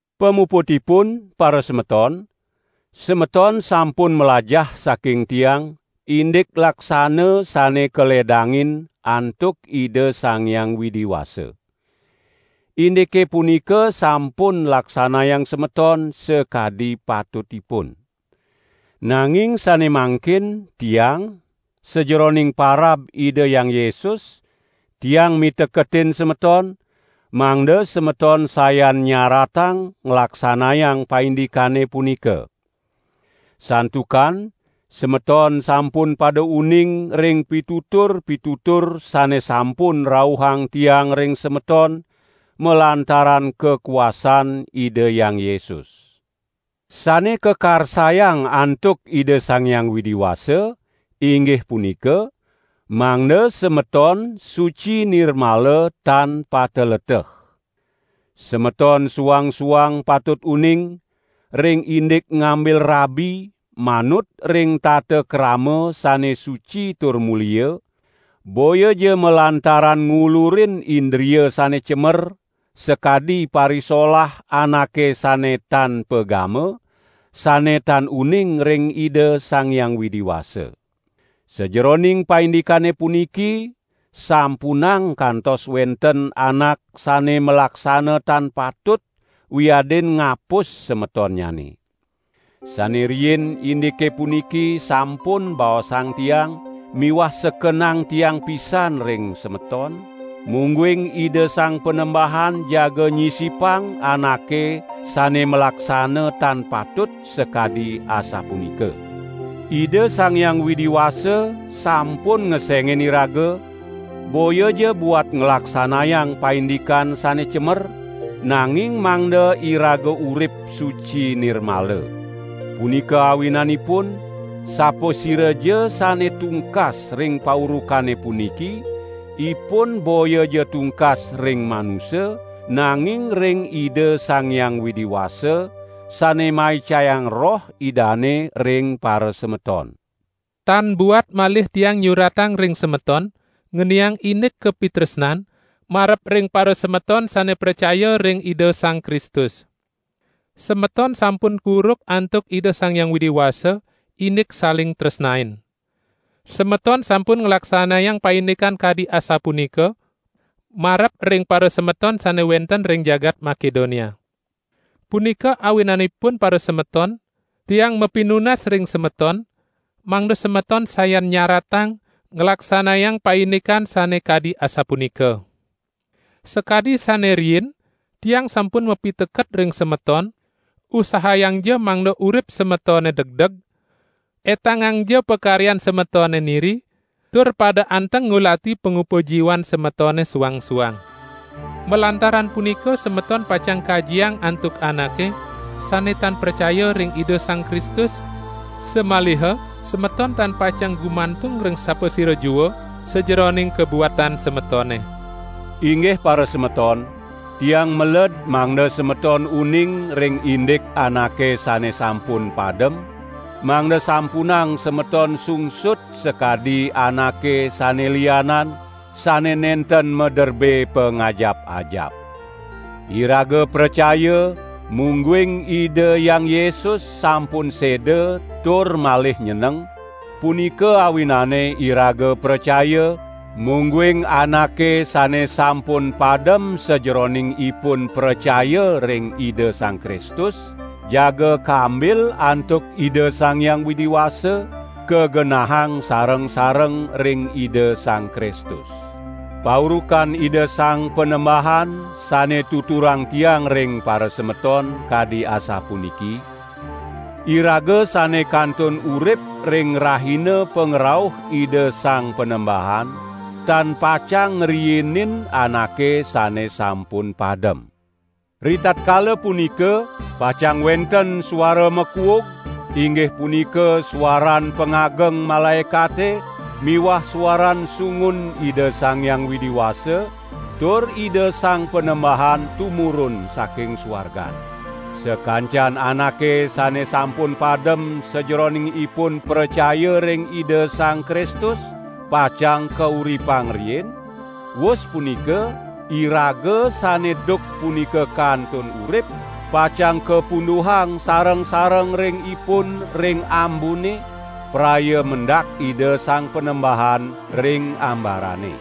Pamuputipun parasemeton, semeton sampun mlajah saking tiang, indik laksana sane kaledangin antuk Ida Sang Hyang Widi Wasa. Indike punika sampun laksanayang semeton sakadi patutipun. Nanging sane mangkin tiang sajeroning parab Ida Hyang Yesus, tiang miteketin semeton, mangda semeton sayan nyaratang nglaksanayang paindikane punika. Santukan semeton sampun pada uning ring pitutur-pitutur sane sampun rauhang tiang ring semeton, malantaran kakuasan Ida Hyang Yesus. Sane kakarsayang antuk Ida Sang Hyang Widi Wasa, inggih punika: mangda semeton suci nirmala tan pateleteh. Semeton suang-suang patut uning, ring indik ngambil rabi manut ring tatakrama sane suci tur mulia, boyaja malantaran ngulurin indria sane cemer, sakadi parisolah anake sane tan pagama, sane tan uning ring Ida Sang Hyang Widi Wasa. Sajeroning paindikane puniki, sampunang kantos wenten anak sane malaksana tan patut wiadin ngapus semetonnyane. Sane riin indike puniki sampun baosang tiang miwah sekenang tiang pisan ring semeton, mungguing Ida Sang Panembahan jaga nyisipang anake sane malaksana tan patut sakadi asapunika. Ida Sang Hyang Widi Wasa sampun ngesengin iraga boyaja buat nglaksanayang paindikan sane cemer, nanging mangda iraga urip suci nirmala. Punika awinanipun, sapasiraja sane tungkas ring paurukane puniki, ipun boyaja tungkas ring manusa, nanging ring Ida Sang Hyang Widi Wasa, sane maicayang Roh Idane ring parasemeton. Tan buat malih tiang nyuratang ring semeton, ngeniang indik kapitresnan marep ring parasemeton sane pracaya ring Ida Sang Kristus. Semeton sampun kuruk antuk Ida Sang Hyang Widi Wasa, indik saling tresnain. Semeton sampun nglaksanayang paindikan kadi asapunika marep ring parasemeton sane wenten ring jagat Makedonia. Punika awinanipun parasemeton, tiang mapinunas ring semeton, mangda semeton sayan nyaratang nglaksanayang paindikan sane kadi asapunika. Sakadi sane riin tiang sampun mapiteket ring semeton, usahayangja mangda urip semetone degdeg, etangangja pakaryan semetone niri, tur pada anteng ngulati pangupa jiwan semetone suang-suang. Malantaran punika semeton pacang kajiang antuk anake sane tan pracaya ring Ida Sang Kristus, samaliha semeton tan pacang gumantung ring sapasira jua sajeroning kabuatan semetone. Inggih parasemeton, tiang meled mangda semeton uning ring indik anake sane sampun padem, mangda sampunang semeton sungsut sakadi anake sane lianan, sane nenten maderbe pangajap-ajap. Iraga pracaya mungguing Ida Hyang Yesus sampun seda tur malih nyeneng; punika awinane iraga pracaya, mungguing anake sane sampun padem sajeroning ipun pracaya ring Ida Sang Kristus, jaga kambil antuk Ida Sang Hyang Widi Wasa kagenahang sareng-sareng ring Ida Sang Kristus. Paurukan Ida Sang Panembahan sane tuturang tiang ring parasemeton, kadi asapuniki: iraga sane kantun urip ring rahina pangrauh Ida Sang Panembahan, tan pacang ngriinin anake sane sampun padem. Ritatkala punika pacang wenten suara makuug, inggih punika suaran pangageng malaekate miwah suaran sungun Ida Sang Hyang Widi Wasa, tur Ida Sang Panembahan tumurun saking suargan. Sakancan anake sane sampun padem sajeroning ipun pracaya ring Ida Sang Kristus, pacang kauripang riin; wus punika, iraga sane duk punika kantun urip, pacang kapunduhang sareng-sareng ring ipun ring ambune, praya mendak Ida Sang Panembahan ring ambarane.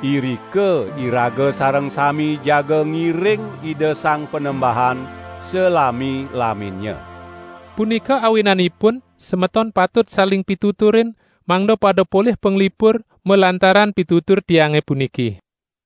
Irika iraga sareng sami jaga ngiring Ida Sang Panembahan salami-laminnya. Punika awinanipun semeton patut saling pituturin mangda pada polih panglipur malantaran pitutur tiange puniki.